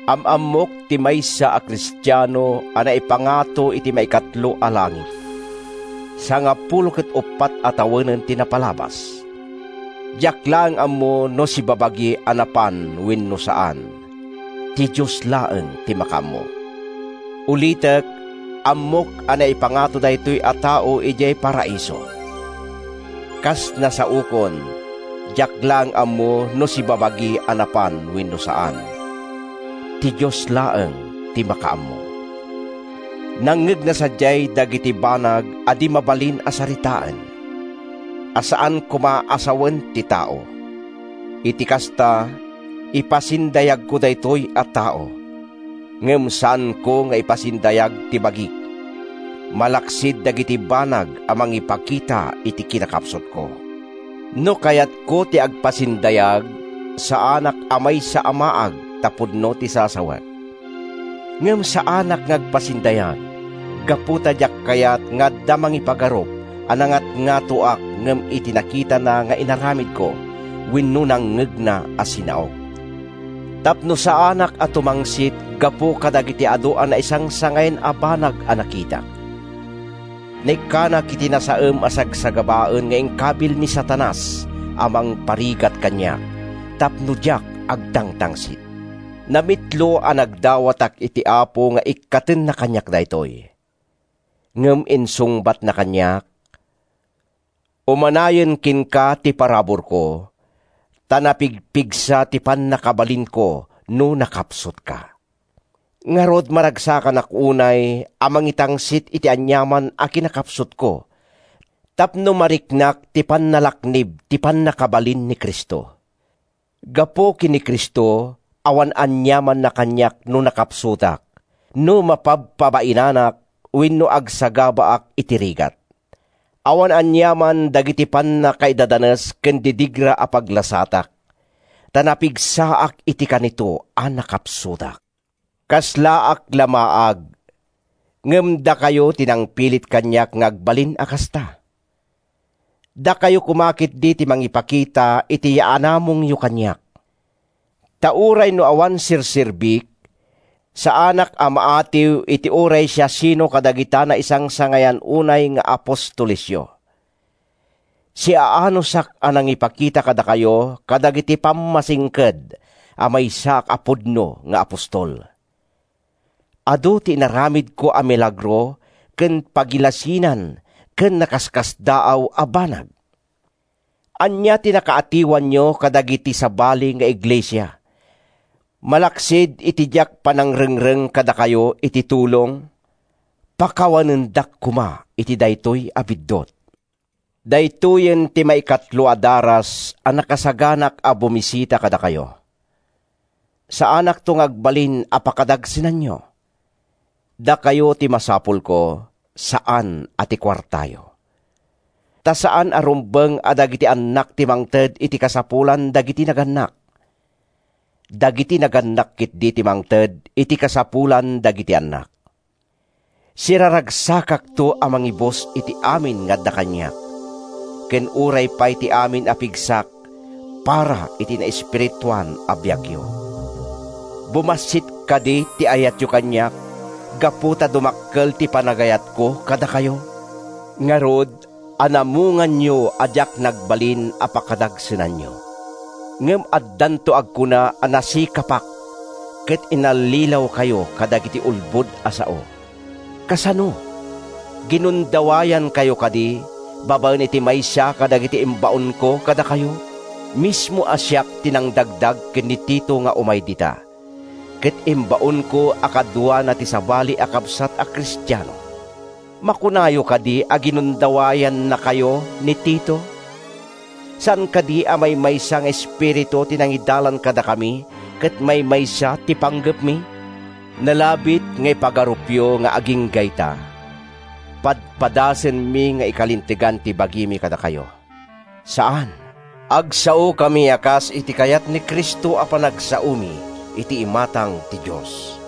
Am-ammok ti maysa a Kristiano a naipangato iti maikatlo a langit. Sangapulo ket uppat a tawenen ti napalabas (diak laeng ammo no sibabagi a napan wenno saan—ti Dios laeng ti makaammo). Ulitek, ammok a naipangato daytoy a tao idiay Paraiso. (Kas nasaokon, diak laeng ammo no sibabagi a napan wenno saan—ti Dios laeng ti makaammo). Nangngegna sadiay dagiti banag a di mabalin a saritaen, a saan koma a sawen ti tao. Iti kasta, ipasindayagko daytoy a tao—ngem saanko nga ipasindayag ti bagik, malaksid dagiti banag a mangipakita iti kinakapsutko. No kayatko ti agpasindayag, saanak a maysa a maag ta pudno ti sasawek. Ngem saanak nga agpasindayag gapu ta diak kayat nga adda mangipagarup a nangatngatoak ngem iti nakitana nga inaramidko wenno nangngegna a sinaok. Tapno saanak nga tumangsit gapu kadagiti adu a naisangsangayan a banag a nakitak, naikkanak iti nasaem a sagsagabaen nga inkabil ni Satanas a mangparigat kaniak tapno diak agtangtangsit. Namitlo a nagdawatak iti Apo nga ikkatenna kaniak daytoy. Ngem insungbatna kaniak: “Umanayen kenka ti paraburko; ta napigpigsa ti pannakabalinko no nakapsutka.” Ngarud, maragsakanak unay a mangitangsit iti aniaman a kinakapsutko tapno mariknak ti pannalaknib ti pannakabalin ni Cristo. Gapu ken ni Cristo, awan aniamanna kaniak no nakapsutak, no mapabpabainanak wenno agsagabaak iti rigat. Awan aniaman dagiti pannakaidadanes ken didigra a paglasatak. Ta napigsaak iti kanito a nakapsutak. Kaslaak la maag—ngem dakayo ti nangpilit kaniak nga agbalin a kasta. Dakayo koma ketdi ti mangipakita iti yaanamongyo kaniak. Ta uray no awan serserbik, saanak a maatiw iti uray siasino kadagita naisangsangayan unay nga “apostolesyo.” Siaanusak a nangipakita kadakayo kadagiti pammasingked a maysaak a pudno nga apostol. Adu ti inaramidko a milagro ken pagilasinan ken nakaskasdaaw a banag. Ania ti nakaatiwanyo kadagiti sabali nga iglesia, malaksid iti diak panangrengreng kadakayo iti tulong? Pakawanendak koma iti daytoy a biddut! Daytoyen ti maikatlo a daras a nakasaganaak a bumisita kadakayo. Saanakto nga agbalin a pakadagsenanyo. Dakayo ti masapulko, saan a ti kuartayo. Ta saan a rumbeng a dagiti annak ti mangted iti kasapulan dagiti nagannak. Dagiti nagannak ketdi ti mangted iti kasapulan dagiti annak. Siraragsakakto a mangibus iti amin nga adda kaniak—ken uray pay ti amin a pigsak para iti naespirituan a biagyo. Bumassit kadi ti ayatyo kaniak gapu ta dumakkel ti panagayatko kadakayo? Ngarud, anamonganyo a diak nagbalin a pakadagsenanyo. Ngem addanto agkuna a nasikapak ket inallilawkayo kadagiti ulbod a sao. Kasano? Ginundawayankayo kadi babaen iti maysa kadagiti imbaonko kadakayo? Mismo a siak ti nangdagdag ken ni Tito nga umay dita, ket imbaonko a kaduana ti sabali a kabsat a Kristiano. Makunayo kadi a ginundawayannakayo ni Tito? Saan kadi a maymaysa nga espiritu ti nangidalan kadakami ket maymaysa ti panggepmi? Nalabit nga ipagarupyo nga agingga ita, padpadasenmi nga ikalintegan ti bagimi kadakayo. Saan! Agsaokami a kas iti kayat ni Cristo a panagsaomi iti imatang ti Dios,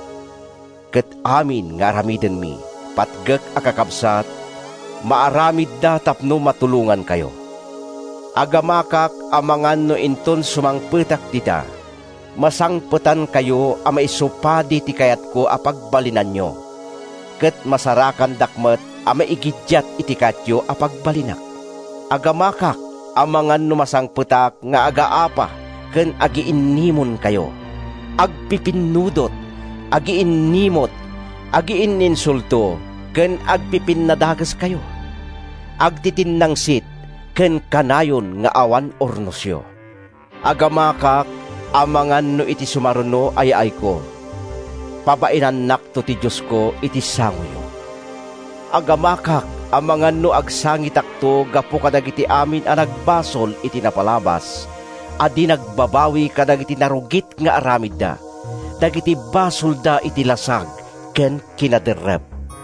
ket amin nga aramidenmi, patgek a kakabsat, maaramidda tapno matulongankayo. Agamakak amangan no inton sumangpetak dita, masangpetankayo a maisupadi iti kayatko a pagbalinanyo ket masarakandak met a maigiddiat iti kayatyo a pagbalinak. Agamakak amangan no masangpetak nga agaapa ken agiinnimonkayo; agpipinnudot; agiinnimut; agiinninsulto ken agpipinnadakeskayo; agtitinnangsit ken kanayon nga awan urnosyo. Agamakak amangan no iti sumaruno a yaayko, pabainannakto ti Diosko iti sangoyo. Agamakak amangan no agsangitakto gapu kadagiti amin a nagbasol iti napalabas a di nagbabawi kadagiti narugit nga aramidda—dagiti basolda iti lasag ken kinaderrep.